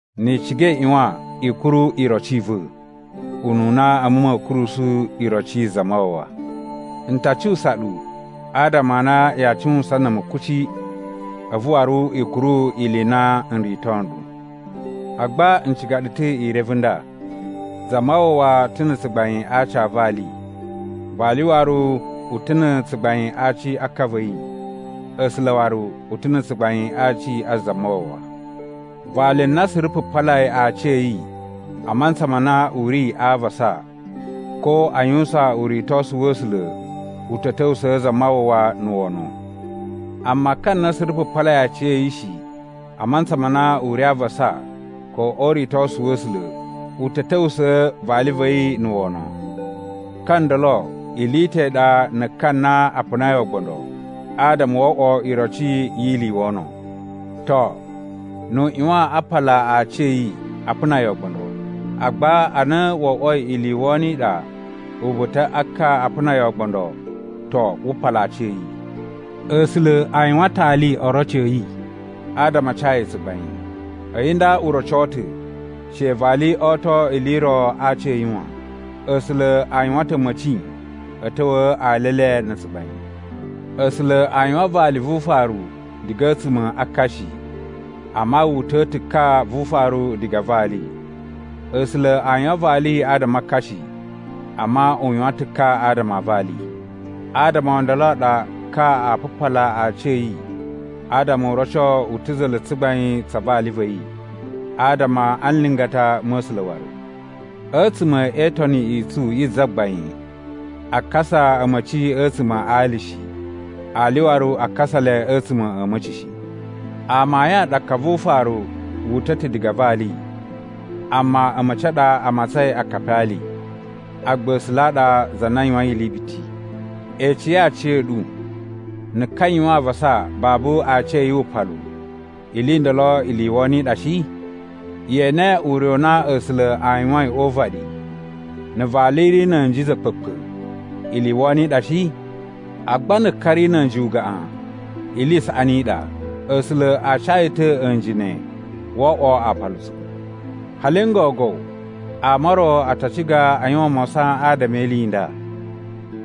Ni i ciga i ꞌyuwan i kuru iroci i va̱, ununa a̱mu ma̱a̱ kurusu iroci yi Zamawawa. N ta cuwusa ɗu adama a na yaa cuwusan na̱ a̱mu kuci, a̱vu waru i kuru ili i na n rito nɗu. Agba n ciga ɗu ta̱ i reve nda: Zamawawa ta̱ na̱ tsugbain a aci a vali, vali waru u ta̱ na̱ tsugbain a aci a ka va̱ yi, A̱sula̱ waru u ta̱ na̱ tsugbain a aci a̱ Zamawawa. Vali na suru pupalai aaci a̱ yi a mantsa ma na u ri a avasa ko a yuwusan uritosu wa̱ A̱sula̱ u ta̱ ta̱wusa̱a̱ Zamawawa na̱ wono. Amma ka na suru pupalai aaci a̱ yi shi a mantsa ma na u ri a avasa ko o uritosu wa̱ A̱sula̱ u ta̱ ta̱wusa̱a̱ vali va̱ yi na̱ wono. Ka ndolo ili i ta̱ i ɗa na̱ ka na a punai ogbondo adama wo oꞌwo iroci yi ili i wono. To, nu u ꞌyuwan a pala aaci a̱ yi a puna yi ogbondo. Agba ana wo oꞌwoi ili i wono i ɗa uba̱ta̱ a ka a puna yi ogbondo, to, wu pala aaci a̱ yi. A̱sula̱ a yuwan ta̱ ali oroci a̱ yi adama a ca yi tsugbain. A̱yi nda u roco ta̱ she vali oto ili i ro a aaci a̱ yi wan. A̱sula̱ a yuwan ta̱ a̱ma̱ci a̱ ta̱wa̱a̱ ali e le na̱ tsugbain. A̱sula̱ a yuwan vali vu ufaru diga a̱tsuma̱ a ka shi, amma wu uta̱a̱ ta̱ ka vu ufaru diga a vali. A̱sula̱ a yuwan vali adama a ka shi, amma u yuwan ta̱ ka adama a vali. Adama o ndolo a ɗa ka a pupala aaci a̱ yi adama u roco u ta̱ za̱la̱ tsugbain tsa vali va̱ yi, adama a nlingata ma̱ A̱sula̱ waru. A̱tsuma̱ e Itoni i tsu yi Zagbain, a kasa a̱ma̱ci a̱tsuma̱ a ali shi, ali waru a kasa le a̱tsuma̱ a̱ a̱ma̱ci shi. Amayun a ɗa ka vu ufaru wu uta̱ ta̱ diga a vali, amma a̱ma̱ci a ɗa a matsain akapi a ali. Agba A̱sula̱ a ɗa za na yuwain ili biti. Ecei aciya̱ɗu, na̱ ka yuwan avasa babu aaci a̱ yi wupalu, ili i ndolo ili i wono i ɗa shi? Ye ene ure u na A̱sula̱ a yuwain o uvaɗi, na̱ vali ri na̱ a̱nji za̱kpa̱kpa̱ ili i wono i ɗa shi? Agba na̱ ka ri na̱ a̱nji ugaꞌan, ili i saꞌani i ɗa. A̱sula̱ a ca yi ta̱ a̱nji ne wo oꞌwo aapalutsu. Hali n gogo ama o ro a ta ciga a yuwan mawasan adama e ili i nda,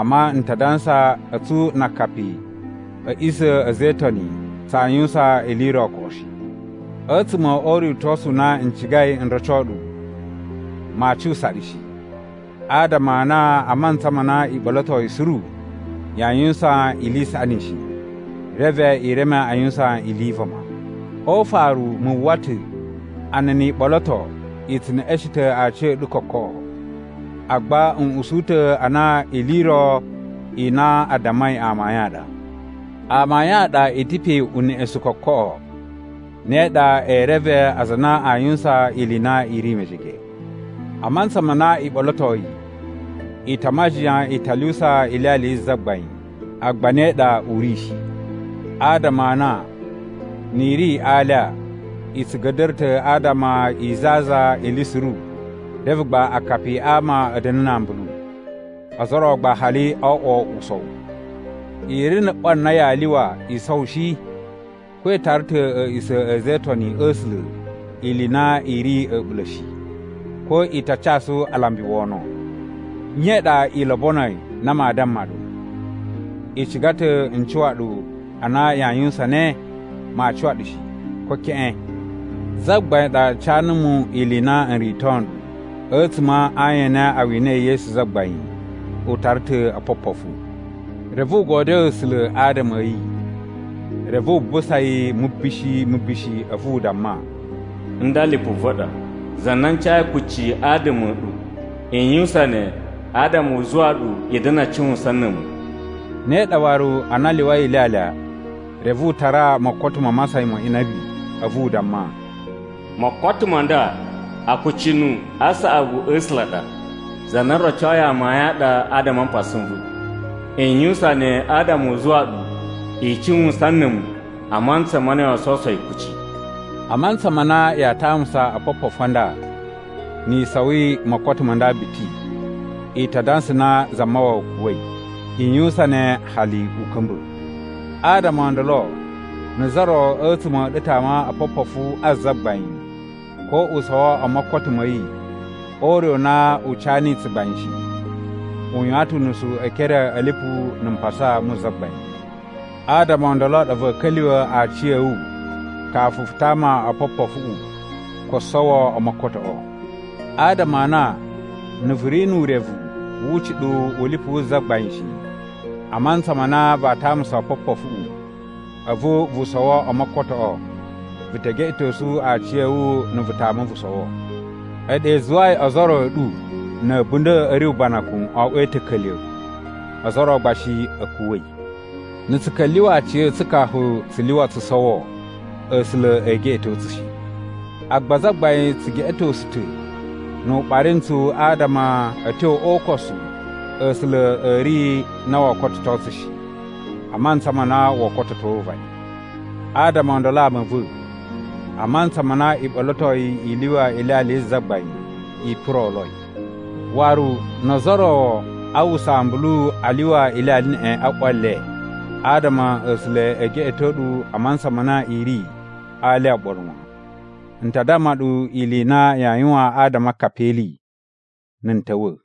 amma n ta dansa a̱tsu na akapi a̱ a̱ꞌisa̱ a̱ a̱za̱ e Itoni tsaa yuwusan ili i ro koꞌo shi. A̱tsuma̱ o uritosu u na n cigai n roco ɗu, maa cuwusa ɗu shi, adama a na a mantsa ma na i ɓolotoi suru, yaa yuwusan ili i saꞌani shi, reve i reme a yuwusan ili i vama. O ufaru, mu uwwa ta̱ a na ni i ɓoloto i tsu neꞌeshen ta̱ aciya̱ɗu kokoꞌo, agba n usu ta̱ a na ili i ro i na a dammai amayun a ɗa. Amayun a ɗa i ta̱ pe uneꞌesun kokoꞌo, ne ɗa e reve aza a na a yuwusan ili i na i ri mejege. A mantsa ma na i ɓolotoi, i ta a majiyan i ta lyuwusa Ilyalya yi Zagbain, agba ne ɗa u ri shi. Adama a na ni i ri a alya, i tsu ga̱da̱ra̱ ta̱ adama i zazan ili suru reve gba akapi a ama a̱ da̱na̱ na ambulu. Ozo o ro gba hali o oꞌwo usowu! I ri na̱ ꞌwa na yaa lyuwa i sowo shi? Ko i tara ta̱ a̱a̱ꞌisa̱ a̱ a̱za̱ e Itoni a̱ A̱sula̱ ili i na i ri a̱ɓula̱ shi? Ko i ta casu alambi wono? Nye i ɗa i lobonoi na maa damma ɗu? I ciga ta̱ n cuwa ɗu a na yaa yuwusan ne? Maa cuwa ɗu shi, ko keꞌen! Zagbain ɗa ca numu ili i na n rito nɗu. A̱tsuma̱ a ayin a na a winai Yesu Zagbain, u tara ta̱ opopofu. Reve u godyoo A̱sula̱ adama a̱ yi. Reve wu busa yi mubishi mubishi a̱vu u damma, “Nda lipu va̱ ɗa, za na n cayi kucci adama a̱ ɗu. I yuwusan ne adama u zuwa ɗu i da̱na̱ a cuwusan na̱ a̱mu.” Ne ɗa waru, ana a lyuwai ilyalya, reve u tara mokoto ma masayan ma inabi, a̱vu u damma, “Mokoto ma nda akucunu a saꞌavu a̱ A̱sula̱ a ɗa, za na o rocoi amayun a ɗa adama a mpasa n va̱. I yuwusan ne adama u zuwa ɗu i cuwusan na̱ a̱mu a mantsa ma na yoo sowuso yi kuci.” A mantsa ma na yaa tamusa opopofu a nda ni i sowi mokoto ma nda biti, i ta dansa na Zamawawa kuwa̱i. I yuwusan ne hali u ka̱mba̱. Adama o ndolo na̱ za ro a̱tsuma̱ a̱ ɗu tama opopofu a Zagbain ko u sowo o mokoto ma̱ yi o ure u na u ca niyi tsugbain shi, u yuwan ta̱ unusu e ekere a̱ lipu na̱ mpasa mu Zagbain. Adama o ndolo a ɗa va̱a̱ ka̱lyuwa̱ aciya̱wu kafu vu tama opopofuꞌu ko sowo o mokotoꞌo. Adama a na na̱ vu ri nu urevu wu ucuɗuwu u lipu wu Zagbain shi a mantsa ma na vaa tamusa opopofuꞌu a̱vu vu sowo o mokotoꞌo, vu te geꞌetosu aciya̱wu na̱ vu tama vu sowo. A̱yi ɗa i zuwai ozo o ro a̱ ɗu na̱ a̱bunda̱ a̱ ri ubanakun o oꞌwoi ta̱ka̱lya̱, ozo o ro gba shi a̱ kuwa̱i. Na̱ tsu ka̱lyuwa̱ aciya̱tsu kafu tsu lyuwa tsu sowo, A̱sula̱ ee geꞌeto tsu shi. Agba Zagbain tsu geꞌetosu ta̱ nu u ɓari ntsu adama a̱ tyo o ukosu A̱sula̱ a̱ ri na woo kototo tsu shi, a mantsa ma na woo kototo uvaɗi. Adama o ndolo ama a̱ va̱, a mantsa ma na i ɓolotoi i lyuwa Ilyalya yi Zagbain, i puroloi. Waru no ozo o ro a uwwusa ambulu a lyuwa ilyalya neꞌen a ꞌwa le, adama A̱sula̱ e geꞌeto ɗu a mantsa ma na i ri alya oɓolo wan. N ta damma ɗu ili i na yaa yuwan adama a akapi e ili, na̱ n ta̱wa̱.